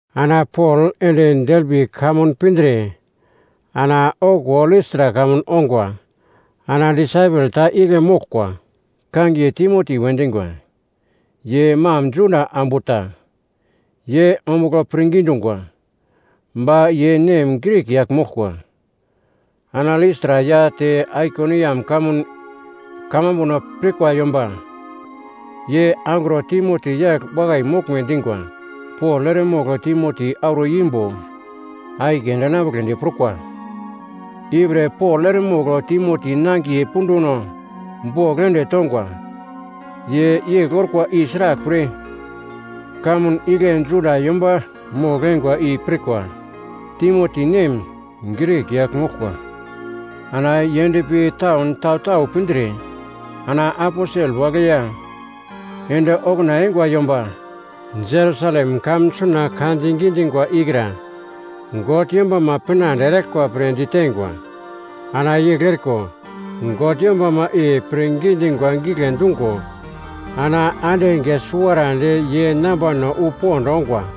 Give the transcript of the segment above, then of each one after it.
Ana Pol ende Derbi kamun pindre ana okuwo Listra kamun ongwa. Ana disaipel ta igle moglkwa, kangiye Timoti we dingwa. Ye mam Juda ambu ta, ye ombugl pirngi dungwa. Ba ye nem Grik yagl moglkwa. Ana Listra ya te Aikoniam kamun kamambuno pirkwa yomba ye angro Timoti yagl wakai moglme dingwa. Pol eremogl Timoti auro imbo akiye ende enambugledi prukwa. Ipre Pol eremogl Timoti nangiye punduno bogl ende tongwa. Ye yegl orkwa i sraglpre, kamun igle Juda yomba mogl-eingwa i pirkwa, Timoti nem, Grik yagl moglkwa. Ana ye endpi taun tau-tau pindre, ana aposel wagle ya ende okuna eingwa yomba Jerusalem kamun suna ka di gidingwa ikra God yombama pinande eraglkwa pre diteingwa. Ana yegl eriko, God yombama i pirngi dingwa gigle dungo, ana ande enge suwarandi ye nambano wu pond ongwa.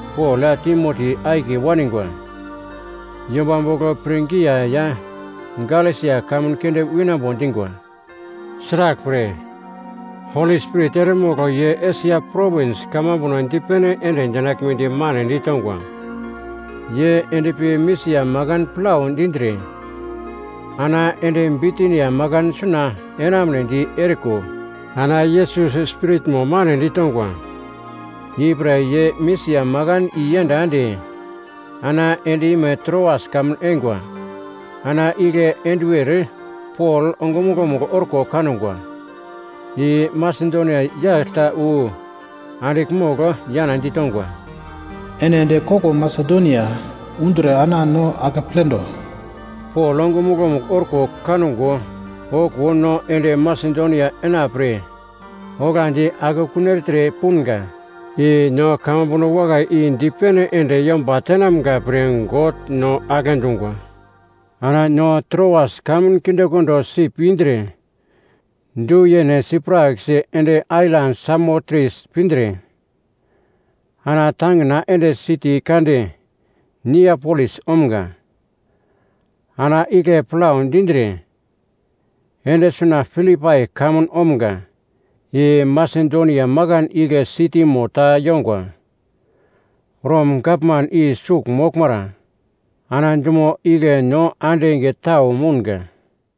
Pol ya Timoti akiye waningwa yomba bogl Prigia ya Galesia kamun keunde winambo dingwa. Sraglpre, Holi Spirit eremogl ye Esia Provins kamambuno dipene ende dinaglmedi mane ditongwa. Ye endpi Misia makan plau dindre, ana ende Bitinia makan suna enamunedi eriko ana Yesus Spiritmo mane ditongwa. Ipre ye Misia makan iyenda ende ana ende ime Troas kamun eingwa. Ana igle enduwer Pol ongumuglo-mugl orko kangwa, i Masedonia yagl ta wu andigl mogl yana ditongwa, “Ene ende koglo Masedonia undre ana no akepledo.” Pol ongumuglo-mugl orko kango, okuwo no ende Masedonia enapre oglandi akekun ertre punga, i no kamambuno wakai i dipene ende yomba tenamga pre God no agle dungwa. Ana no Troas kamun kindekondo sip indre du yene sipraksi ende ailan Samotres pindre, ana tangina ende siti kande Niapolis omga. Ana igle plau dindre, ende suna Filipai kamun omga, i Masedonia makan igle sitimo ta yongwa. Rom gavman i sugl moglmara. Ana dumo igle no ande enge tau mounga.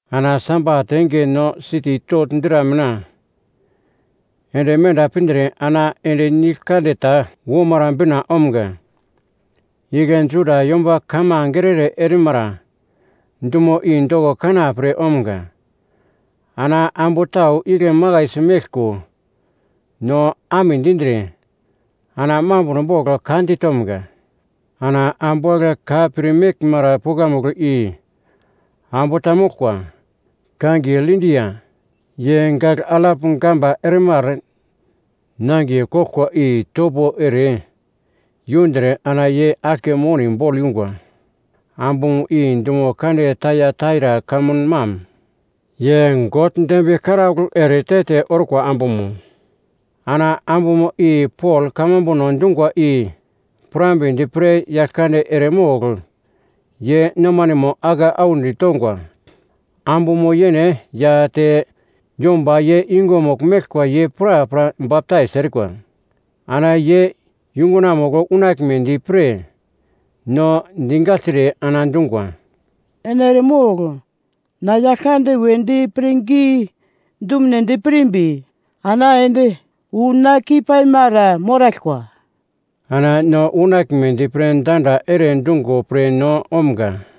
Ana Sabat enge no siti togl dra mina ende menda pindre ana ende nigl kande ta womara bina omga. Igle Juda yomba kamange ere-ere erimara dumo i doko kanapre omga. Ana ambu tau igle makaisi meglko no amedindre, ana mambuno bogl ka ditomga. Ana ambu wagle ka pir meglmara pukamugl i ambu ta moglkwa, kangiye Lidia. Ye gagl alap gamba ermar nangiye koglkwa i topo ere yundre ana ye aglke moni bogl yungwa, ambumo i dumo kande Taiataira kamun mam. Ye God dembiye karaugl ere te-te orkwa ambumo, ana ambumo i Pol kamambuno dungwa i pirambedi pre Yaglkande eremogl ye nomanemo ake audi tongwa. Ambumo yene ya te yomba ye yungumugl meglkwa ye prapra baptais erikwa, ana ye yungunamugl unaglmedi pre no digagltre, ana dungwa, “Ene eremogl na Yaglkande wedi pirngi dumedi pirmbi ana ende wu na keipaimara moraglkwa.” Ana no unaglmedi pre danda ere dungo pre no omga.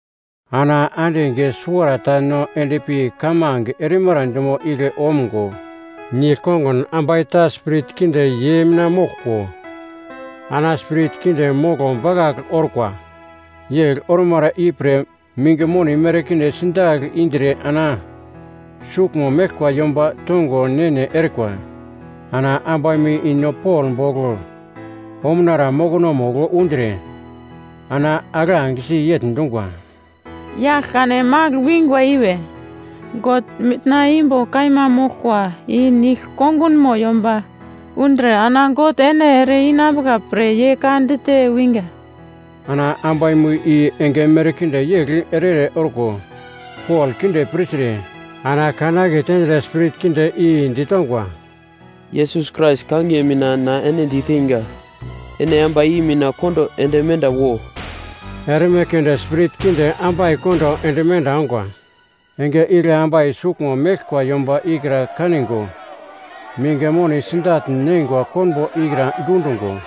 Ana ande enge suwarata no endpi kamange erimara dumo igle omgo, nigl-kongun ambai ta spirit kinde ye mina moglko, ana spirit kinde moglo bakagl orkwa. Yegl ormara ipre minge moni merkinde sidagl indre ana suglmo meglkwa yomba tongo ne-ne erikwa. Ana ambaimo i no Pol bogl omunara mokonomugl undre ana aglangesi yegl dungwa, “Yagl kane magl wingwa i we, God mitna imbo kaima moglkwa i nigl-kongunmo yomba undre, ana God ene ere-inambuka pre ye ka dite winga.” Ana ambaimo i enge merkinde yegl ere-ere orko Pol kinde pirtre, ana kan aketendre spirit kinde i ditongwa, “Yesus Krais kangiye mina na ene diteinga, ene ambai i mina kondo ende menda wo.” Erme keunde spirit kinde ambai kondo ende menda ongwa. Enge igle ambai suglmo meglkwa yomba ikra kaningo minge moni sidagl neingwa konbo ikra dundungo,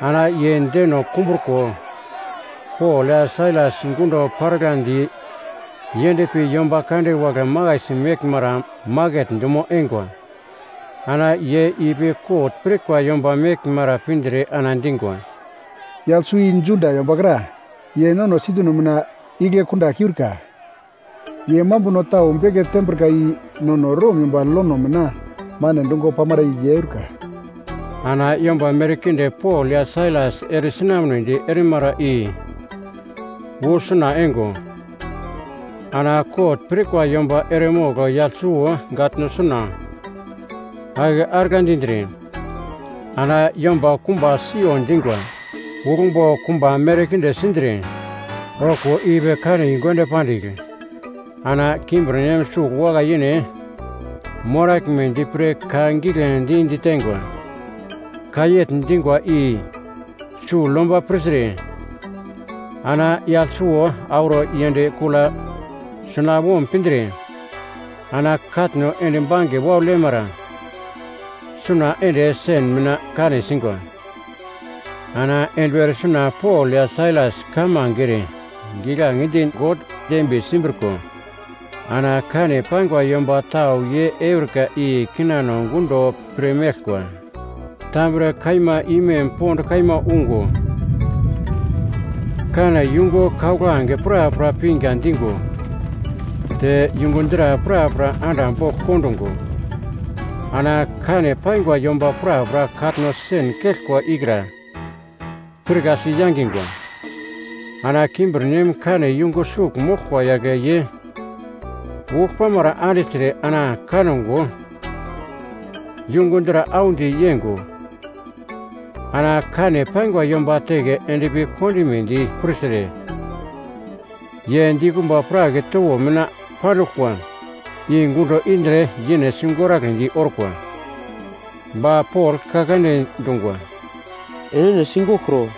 ana ye deno kumbruko, Pol ya Sailas gundo paraglandi yendpi yomba kande wagle makaisi meglmara maket dumo eingwa. Ana ye ipi kot pirkwa yomba meglmara pindre ana dingwa, “Yagl suwo i Juda yomba kra, ye no sitino mina igle kunda keurka. Ye mambuno tau beke tembrika i nono Rom yomba lono mina mane dungo pamara i ye eurika.” Ana yomba merkinde Pol ya Sailas eresinamnedi erimara i wu suna eingo, ana kot pirkwa yomba eremogl yagl suwo gatno suna ake arigla dindre, ana yomba kumba siyo dingwa. Uglmbo kumba merkinde sindre, okuwo ipi kane yungu ende pandigl, ana kimbirnem sugl wakai-yene moraglmedi pre ka giglendi diteingwa. Ka yegl dingwa i sugl yomba pirtre, ana yagl suwo auro yend kula sunawom pindre, ana katno endi bange waugl yemara suna ende sen mina kane singwa. Ana enduwer suna Pol ya Sailas kamange ere, giglange di God dembiye simbriko, ana kane paingwa yomba tau ye eurika i kinano gundo pirmeglkwa. Tambre kaima imem pond kaima ungo, kane yungu kauglange prapra pinga dingo, te yungu dra prapra anda bogl kondungo ana kane paingwa yomba prapra katno sen keglkwa ikra pirkasi yangingwa. Ana kimbirnem kane yungu sugl moglkwa yagle ye uglpamara andigltre ana kango yungu dra audi yeingo, ana kane paingwa yomba teke endpi kondimedi pirtre, ye dikumba prak towo mina panduglkwa i gundo indre yene sigoragledi orkwa. Ba Pol ka kande dungwa, “Enene sigoglkro.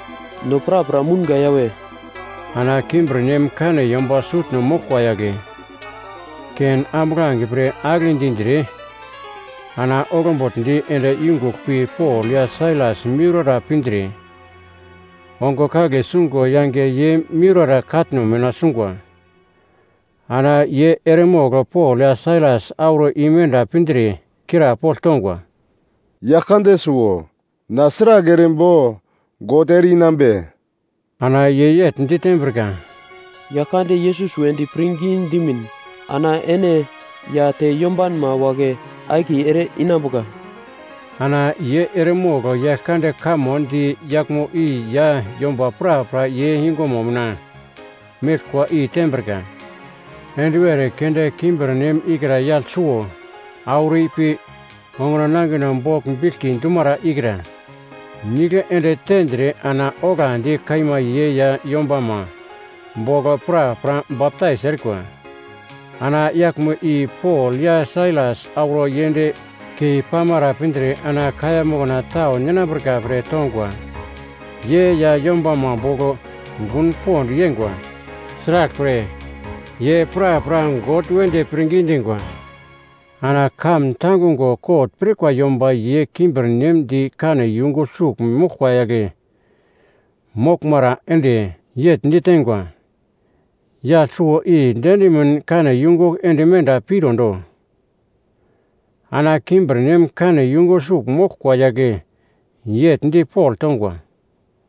No prapra mounga yawe!” Ana kimbirnem kane yomba sutno moglkwa yagle, ken ambuglange pre agle dindre ana oglbugldi ende yungugl pi Pol ya Sailas miurara pindre ongo kagle sungo yange ye miurara katno mina sungwa. Ana ye eremogl Pol ya Sailas auro imenda pindre krapogl tongwa, “Yaglkande suwo! Na sragl erimbo God ere-i nambe?” Ana ye yegl ditembrika, “Yaglkande Yesus wedi pirngi dimin ana ene ya te yombanma wagle akiye ere-inambuka.” Ana ye eremogl Yaglkande kamo di yaglmo i ya yomba prapra ye yungumo mina meglkwa i tembrika. Enduwer keunde kimbirnem ikra yagl suwo auro ipi onguno nangino bogl biglki dumara ikra nigl ende tendre ana oglandi kaima ye ya yombama bogl prapra baptais erikwa. Ana yaglmo i Pol ya Sailas auro yend keipamara pindre ana kaiya mokna tau ninambrika pre tongwa. Ye ya yombama bogl gun pond yeingwa, sraglpre, ye prapra God wedi pirngi dingwa. Ana kamun tangungo kot pirkwa yomba ye kimbirnem di kane yungu sugl moglkwa yagle moglmara ende, yegl diteingwa, “Yagl suwo i diendimin kane yungu ende menda pirondo.” Ana kimbirnem kane yungu sugl moglkwa yagle yegl di Pol tongwa,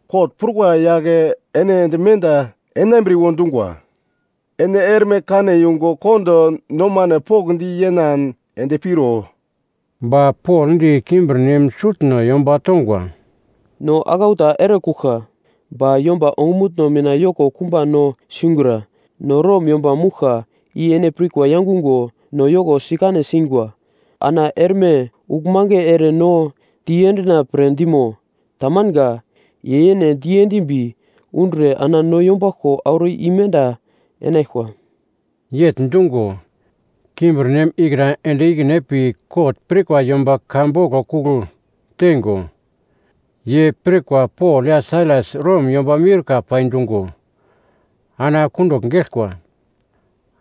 “Kot prukwa yagle ene ende menda enambriwo dungwa. Ene erme kane yungu kondo nomano pokndi yenan ende piro.” Ba Pol di kimbirnem sutno yomba tongwa, “No aglau ta erekuglka, ba yomba ongumutno mina yoko kumba no singura. No Rom yomba mouglka i ene pirkwa yangungo no yoko sikane singwa. Ana erme uglmange ere no diendina pre dimo! Tamanga! Ye yene diendimbi undre ana no yombaglko auro imenda enaglkwa.” Yegl dungo, kimbirnem ikra ende ikine pi kot pirkwa yomba ka boglo kugl teingo, ye pirkwa Pol ya Sailas Rom yomba miurka pai dungo ana kundugl geglkwa.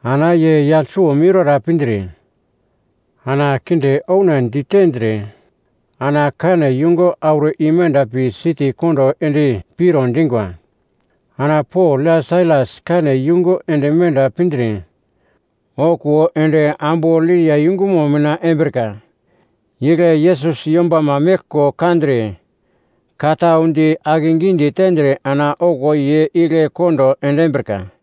Ana ye yagl suwo miurara pindre, ana kinde oune ditendre ana kane yungu auro imenda pi siti kondo ende piro dingwa. Ana Pol ya Sailas kane yungu ende menda pindre, okuwo ende ambu Lidia yungumo mina embrika, igle Yesus yombama meglko kandre, ka tau di akegidi tendre ana okuwo ye igle kondo endimbrika.